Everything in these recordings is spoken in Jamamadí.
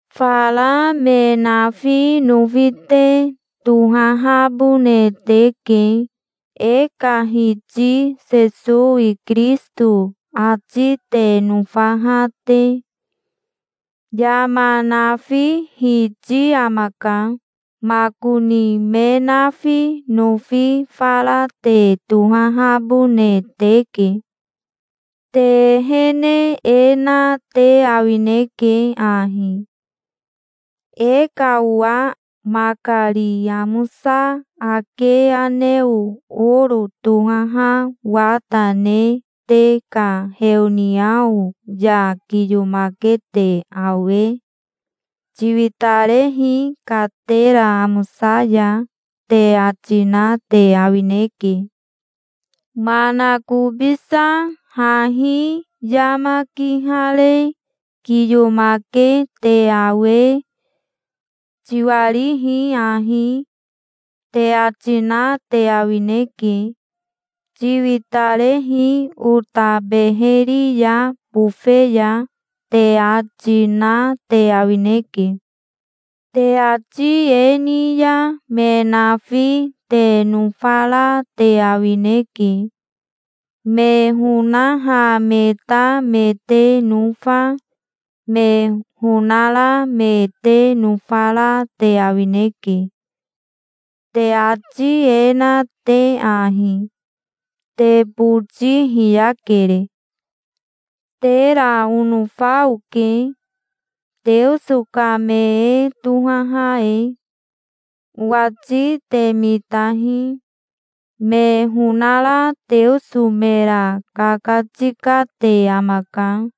Fara me nafi nofi te tohahabone teke, e ka Hiti Sesowi Kirisito ati te nofaha te. Yama nafi Hiti amaka. Makoni me nafi nofi fara te tohahabone teke. Te ehene e na te awineke ahi: e ka owa makari amosa ake aneo oro tohaha wata ne te ka heoniao ya kiyomake te awe, "Tiwitarehi katera amosa ya", te ati na te awineke. Manakobisa hahi yama kihare kiyomake te awe, "Tiwarihi ahi", te ati na te awineke. "Tiwitarehi ota beheri ya bofe ya", te ati, na te awineke. Te ati e ni ya me nafi te nofara te awineke. Me honaha me ta me te nofa, me honara me te nofara te awineke, te ati e na te ahi. Te boti hiyakere. Tera onofa oke, Teoso ka me e tohaha e. Owati te mitahi. Me honara Teoso mera kakatikate amaka,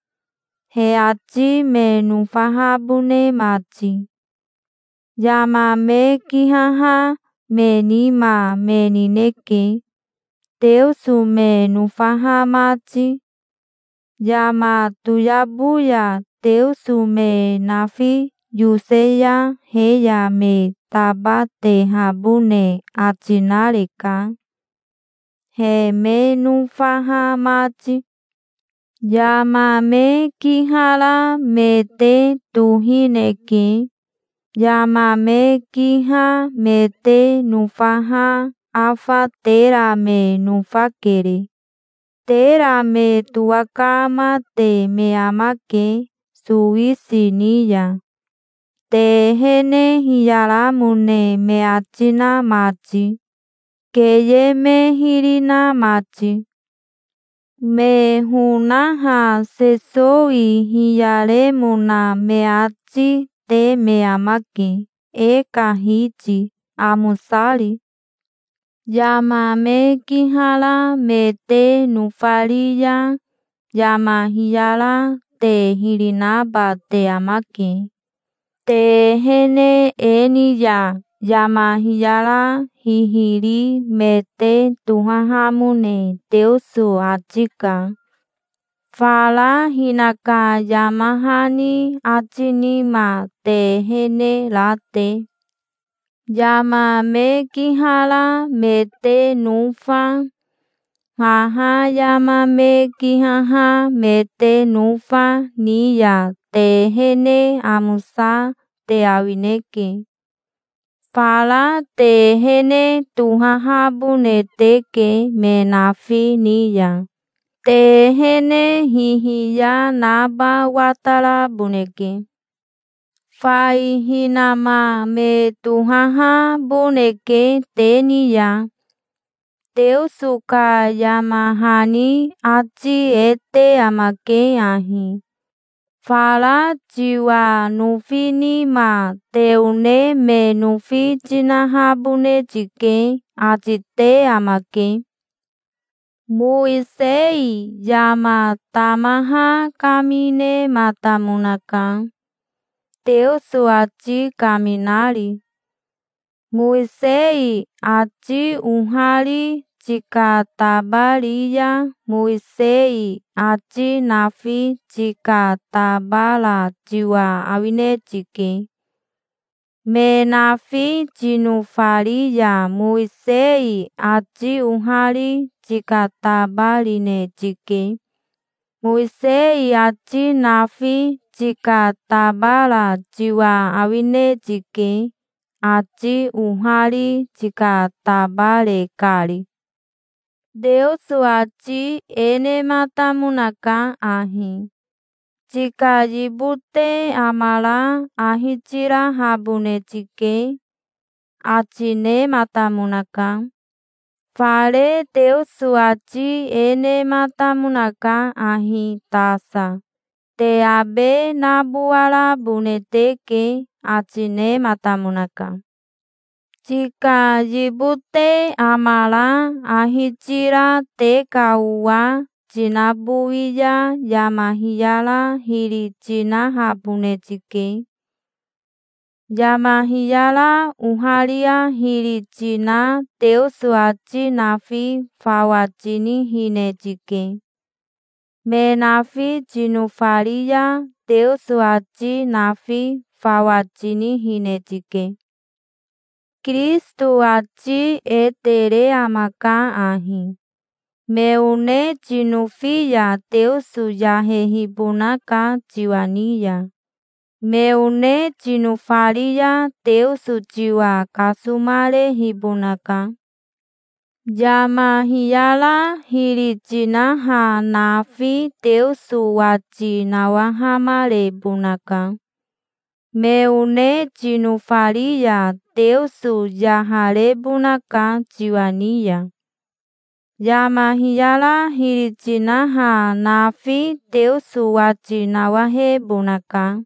he ati me nofahabone mati. Yama me kihaha me nima me nineke, Teoso me nofaha mati. Yama toyabo ya Teoso me nafi yose ya he ya me tabatehabone ati nareka, he me nofaha mati. Yama me kihara me te tohineke. Yama me kiha me te nofaha afa tera me nofakere. Tera me towakamate me amake sowisi ni ya, te ehene hiyaramone me ati na mati, keye me hiri na mati. Me honaha Sesowi hiyaremona me ati, te me amake, e ka Hiti, amosari. Yama me kihara me te nofari ya yama hiyara te hiri naba te amake. Te ehene e ni ya yama hiyara hihiri me te tohahamone Teoso ati ka, fara hinaka yama hani ati nima te ehene ra te. Yama me kihara me te nofa, haha yama me kihaha me te nofa, ni ya te ehene amosa te awineke. Fara te ehene tohahabone teke me nafi ni ya. Te ehene hihiya naba wataraboneke. Fai hinama me tohahaboneke te ni ya. Teoso ka yama hani ati e te amake ahi: "Fara tiwa nofi nima te one me nofi tinahabone tike", ati te amake. Mowisei yama tamaha kaminematamonaka, Teoso ati kaminari. Mowisei ati ohari tikatabari ya Mowisei ati nafi tikatabara tiwa awine tike. Me nafi tinofari ya Mowisei ati ohari tikatabarine tike. Mowisei ati nafi tikatabara tiwa awine tike, ati ohari tikatabare kari. Teoso ati e nematamonaka ahi: "Tika yibote amara ahi tirahabone tike", ati nematamonaka. Fare Teoso ati e nematamonaka ahi tasa: Te abe nabowarabone teke", ati nematamonaka. Tika yibote amara ahi tira te ka owa tinabowi ya yama hiyara hiri tinahabone tike. Yama hiyara oharia hiri tina Teoso ati nafi fawa tinihine tike. Me nafi tinofari ya Teoso ati nafi fawa tinihine tike. Kirisito ati e tere amaka ahi. Me one tinofi ya Teoso yahehibonaka tiwa ni ya. Me one tinofari ya Teoso tiwa kasomarehibonaka. Yama hiyara hiri tinaha nafi Teoso wati nawahamarebonaka. Me one tinofari ya Teoso yaharebonaka tiwa ni ya. Yama hiyara hiri tinaha nafi Teoso wati nawahebonaka.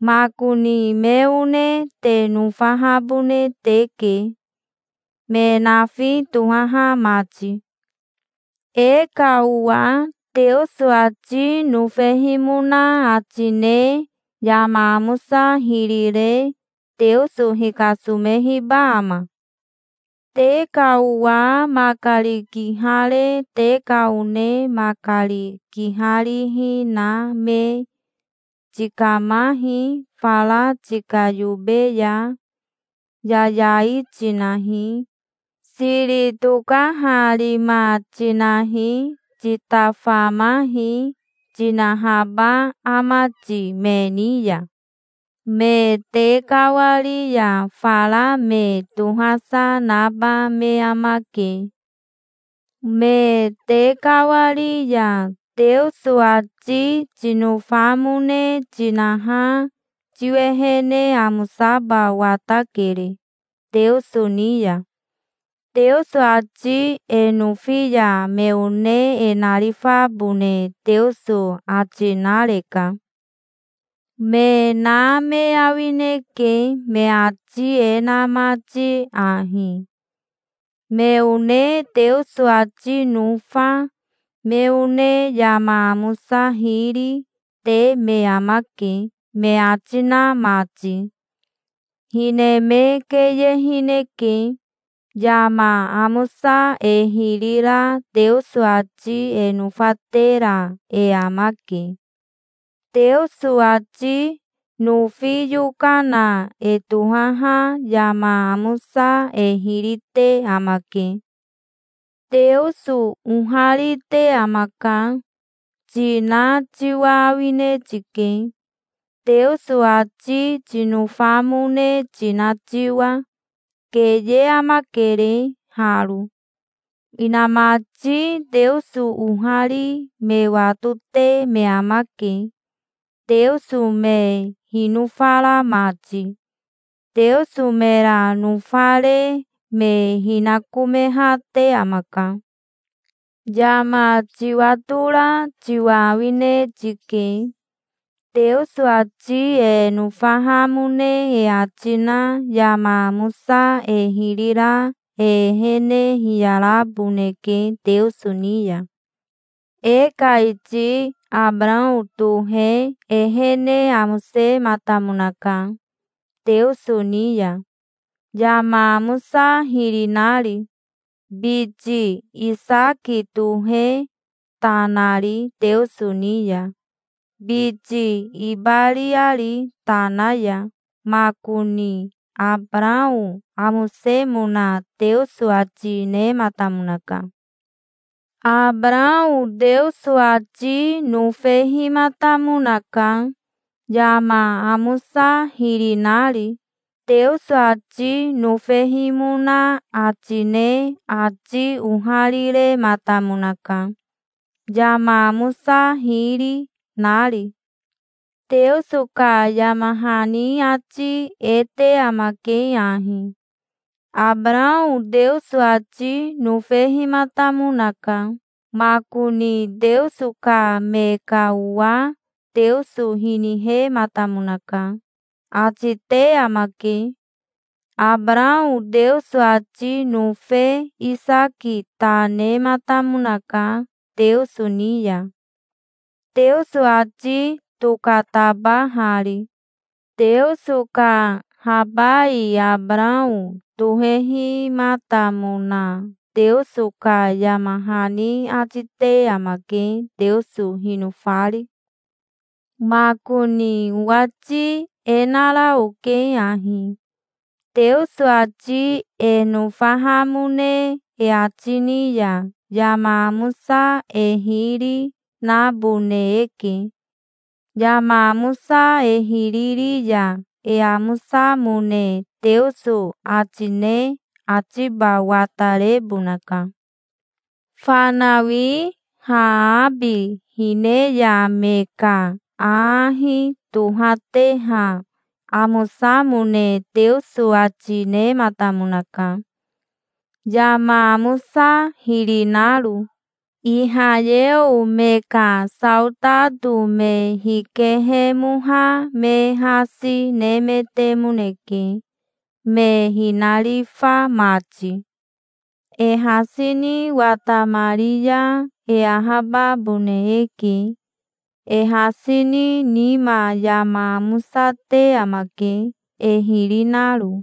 Makoni me one te nofahabone teke, me nafi tohaha mati. E ka owa Teoso ati nofehimona ati ne yama amosa hiri re Teoso hikasomehiba ama? Te ka owa makari kihare te ka one makari kiharihi na me, "Tikamahi, fara tika yobe ya. Yayai tinahi. Siri tokaharima tinahi. Titafamahi", tinahaba ama ti me ni ya? Me tekawari ya fara me tohasa naba me amake. Me tekawari ya Teoso ati tinofamone tinaha tiwehene amosaba watakere Teoso ni ya. Teoso ati e nofi ya me one e narifabone Teoso ati nareka. Me na me awineke me ati e na mati ahi: "Me one Teoso ati nofa, me one yama amosa hiri, te me amake", me ati na mati. Hine me keyehineke. Yama amosa e hiri ra Teoso ati e nofatera e amake. Teoso ati nofi yokana e tohaha yama amosa e hiri te amake. "Teoso oharite amaka", tina tiwa awine tike, Teoso ati tinofamone tina tiwa. Keye amakere haro. Inamati Teoso ohari me watote me amake, Teoso me hinofara mati. Teoso mera nofare me hinakomehate amaka. Yama tiwatora tiwa awine tike. Teoso ati e nofahamone e ati na yama amosa e hiri ra e ehene hiyaraboneke Teoso ni ya. E ka iti Abarao tohe ehene amosematamonaka Teoso ni ya, yama amosa hiri nari, biti Isaki tohe ta nari Teoso ni ya, biti ibariari tana ya. Makoni Abarao amosemona Teoso ati nematamonaka. Abarao Teoso ati nofehimatamonaka, yama amosa hiri nari. Teoso ati nofehimona ati ne ati oharirematamonaka, yama amosa hiri, nari. Teoso ka yama hani ati e te amake ahi: "Abarao Teoso ati nofehimatamonaka. Makoni Teoso ka me ka owa Teoso hinihematamonaka", ati te amake. Abarao Teoso ati nofe Isaki ta nematamonaka Teoso ni ya, Teoso ati tokatabahari. Teoso ka habai Abarao tohehimatamona Teoso ka yama hani ati te amake, Teoso hinofari. Makoni owati e nara oke ahi: Teoso ati e nofahamone e ati ni ya yama amosa e hiri, nabone eke. Yama amosa e hiri ri ya e amosamone Teoso ati ne atiba watarebonaka. Fanawi Haabi hine ya me ka aahi tohateha amosamone Teoso ati nematamonaka, yama amosa hiri naro. Ihayeo me ka saotato me hikehemoha me hasi nemetemoneke, me hinarifa mati. E hasi ni watamari ya e ahababone eke. E hasi ni nima yama amosa te amake, e hiri naro.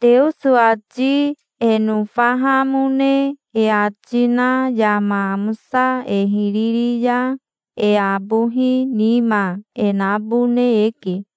Teoso ati e nofahamone e ati na yama amosa e hiri ri ya e abohi nima e nabone eke.